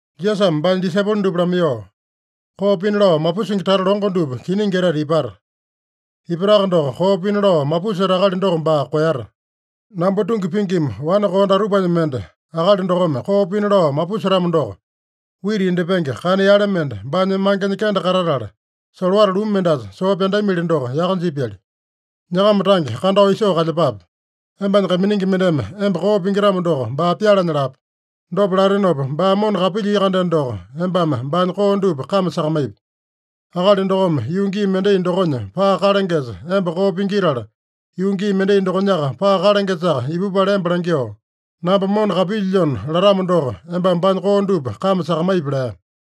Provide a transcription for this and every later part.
Jisasame baanya disaipolo dupa lamaiyoo, “Koo pina lao mapusingi tata longo dupa kiningi etete ipata. Ipataka doko, koo pina lao mapuseta akali doko baa koeyata! Namba tungi pingima wane koo datupanya mende akali dokome koo pina lao mapusetamo doko, wita indyepenge kana yale mende baanya mangenya kende katatala, solowata lumu mendasa soo pyandamili doko yaka jipyali. Nyakama tange kandao isoo kalyepape. Embanya kaiminingi mendeme emba koo pingitamo doko, baa pyalanya lape. Dopa latenopa baa mona kapilyia-kandeno doko, embame baanya koo dupa kame sakamaipi. Akali dokome yuu gii mendai dokonya paa kalangesa emba koo pingitala, yuu gii mendai dokonyaka paa kalangesaka ipupala emba langyoo, ‘Namba mona kapilyilyona’ latamo doko, embame baanya koo dupa kame sakamaipi” lea.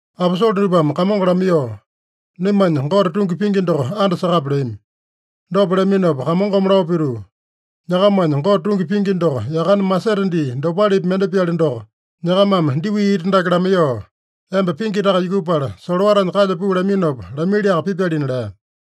Aposole dupame Kamongo lamaiyoo, “Naimanya Gote tungi pingi doko andasakape” leami. Dopa leaminopa Kamongome lao pituu, “Nyakamanya Gote tungi pingi doko yakane masete dii dopalepi mende-pyali doko, nyakamame diwi ita dake lamaiyoo, ‘Emba pingitaka yukupala, solowatanya kalya puu’ laminopa lamiliaka pipyalina” lea.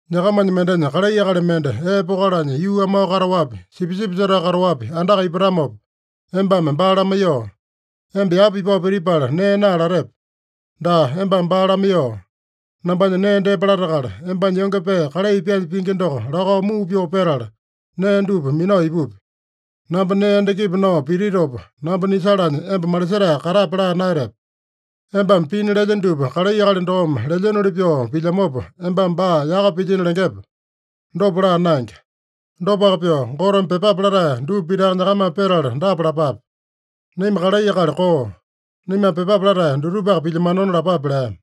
“Nyakamanya mendenya kalai akali mende ee pokalanya yuu amao kataowapi, sipisipi setao kataowapi andaka ipatamopa, embame baa lamaiyoo, ‘Emba yapa ipao pitipala nee naa’ latepe? Daa, embame baa lamaiyoo, ‘Nambanya nee depa latakala, embanya yonge pee kalai pyaanya pingi doko lakao muu pyoo petala, nee dupa minao ipupi. Namba nee endakipi nao pititopa, namba nisalanya emba malisetae katape’ laa naeyatepe? Embame pina lelye dupa kalai akali dokome lelyenoli pyoo pilyamopa, embame baa yaka pilyino lengepe? Dopa laa naenge. Dopaka pyoo, Goteme pyepape latae dupa pitaka nyakamame petala dapa lapape: ‘Naima kalai akali koo. Naimame pyepape latae dutupaka pilyamanona’ lapape” lea.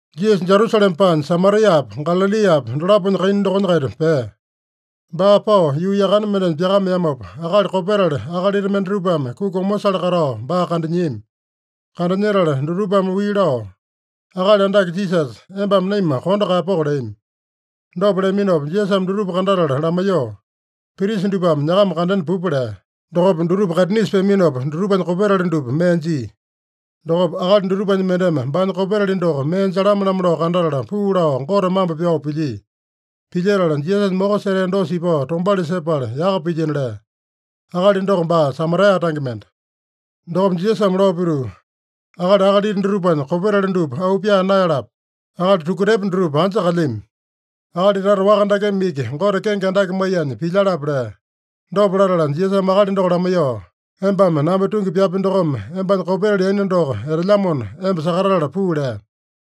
Jisasa Jerusalema paanya, Samariapa, Galaliapa dolaponya kaina dokonya-kaita pea. Baa pao yuu yakane mendenya pyakameamopa, akali kopetali akalita mendatupame kuki omosale katao baa kandanyiami. Kandanyetala dutupame wii lao, “Akali Andake Jisasa, embame naima kondo kaeyapoko” leami. Dopa leaminopa Jisasame dutupa kandatala lamaiyoo, “Prisa dupame nyakama kandena pupa” lea. Dokopa dutupa kaitinisa peaminopa, dutupanya kopetali dupa mee jia. Dokopa akali dutupanya mendeme baanya kopetali doko mee jalame-lamo lao kandatala, puu lao Gote mambo pyao pilyia. Pilyetala, Jisasanya moko setea dosa ipao tombauli sepala, yaka pilyino lea. (Akali doko baa Samaria tange mende.) Dokopa Jisasame lao pituu, “Akali akalita dutupanya kopetali dupa auu pyaa naeyalape? Akali tukutepo dutupa anja kalyami? Akali tata waka dakeme iki Gote kenge andake maiyanya pilyalape?” lea. Dopa latala Jisasame akali doko lamaiyoo, “Embame namba tungi pyapi dokome embanya kopetali yaina doko etelyamona, emba sakatatala puu” lea.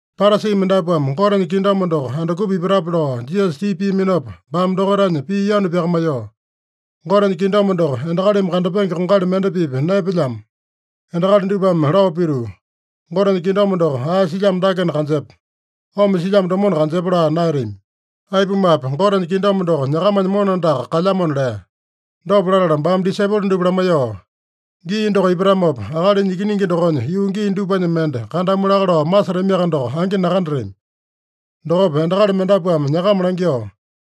Parasi mendapuame Gotenya kingdom doko andukupa ipatape lao Jisasa tipa piaminopa, baame dokaitanya pii yanu pyakamaiyoo, “Gotenya kingdom doko endakalimi kandapenge kongali mende-pipa naepelyamo. Endakali dupame lao pituu, ‘Gotenya kingdom doko ae silyamo dakena kanjepa. Omo silyamo domona kanjepa’ laa naeyatami. Aipumape, Gotenya kingdom doko nyakamanya mona andaka kalyamona” lea. Dopa latala baame disaipolo dupa lamaiyoo, “Gii doko ipatamopa, Akalinya Ikiningi dokonya yuu gii dupanya mende kandamu laka lao masetamiaka doko, angi nakandatami. Dokopa endakali mendapuame nyakama langyoo,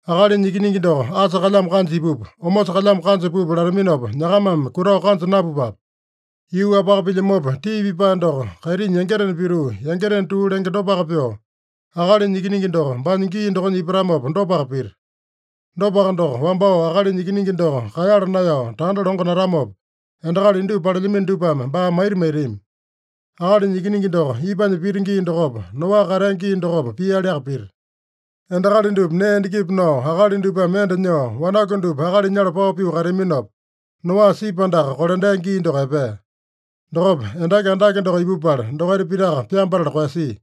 ‘Akalinya Ikiningi doko asa kalyamo kanja ipupa, omosa kalyamo kanja pupa’ lataminopa, nyakamame kutao kanja napupape. Yuu-wapaka pilyamopa, tii pipae doko kaitinya yangitena pituu, yangitena tuu lenge dopaka pyoo, Akalinya Ikiningi doko baanya gii dokonya ipatamopa dopaka pita. Dopaka doko, wambao Akalinya Ikiningi doko kaeyala naeyao tanda longo natamopa, endakali indupa palelyamino dupame baa maita maitami. Akalinya Ikiningi doko ipanya pita gii dokopa, Noa katea gii dokopa pialiaka pita. Endakali dupa nee endakipi nao, akali dupame enda nyoo, wanaku dupa akali nyala pao pyoo kateaminopa, Noa sipi andaka kolandea gii doko epea. Dokopa endaki andake doko ipupala, dokaita pitaka pyambatala koeyasia.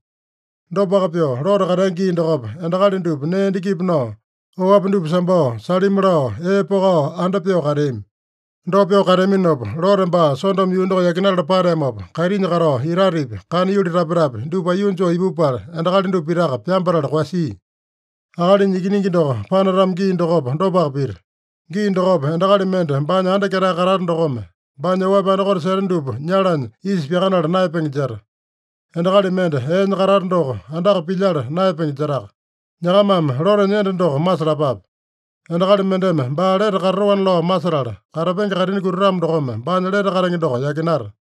Dopaka pyoo, Lote katea gii dokopa, endakali dupa nee endakipi nao, oapi dupa sambao, salimi lao, ee pokao, anda pyoo kateami. Dopa pyoo kateaminopa, Lote baa Sodomo yuu doko yakinatala pateamopa, kaitinya katao itatepi, kana yuli tapetapi, dupa aiyuu joo ipupala, endakali dupa pitaka pyambatala koeyasia. Akalinya Ikiningi doko panatamo gii dokopa, dopaka pita. Gii dokopa endakali mende baanya anda ketae katata dokome, baanya oapi andakote seta dupa nyalanya isa pyakanala naeyapenge jeta. Endakali mende eenya katata doko, andaka pilyala naeyapenge jetaka. Nyakamame Lotenya enda doko masalapape. Endakali mendeme baa lete katatoana lao masetala, katapenge kaitini kutatamo dokome baanya lete katenge doko yakinata.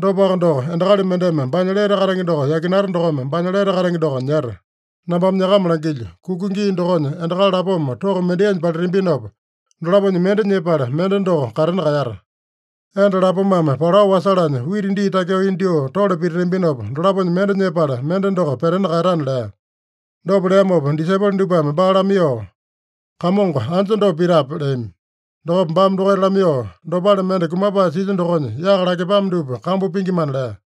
Dopaka doko, endakali mendeme baanya lete katenge doko yakinata dokome baanya lete katenge doko nyeta. Nambame nyakama langilyo: Kuka gii dokonya endakali lapoma toko mendainya palitambinopa, dolaponya mende nyepala, mende doko katena kaeyata. Enda lapomame palao wasalanya wita dii takyoo indyoo tole pititambinopa, dolaponya mende nyepala, mende doko petena kaeyatana” lea. Dopa leamopa disaipolo dupame baa lamaiyoo, “Kamongo, anja dopa pitape?” leami. Dokopa baame dokaita lamaiyoo, “Dopale mende kumapae silya dokonya yaka lakepame dupa kambu pingimana” lea.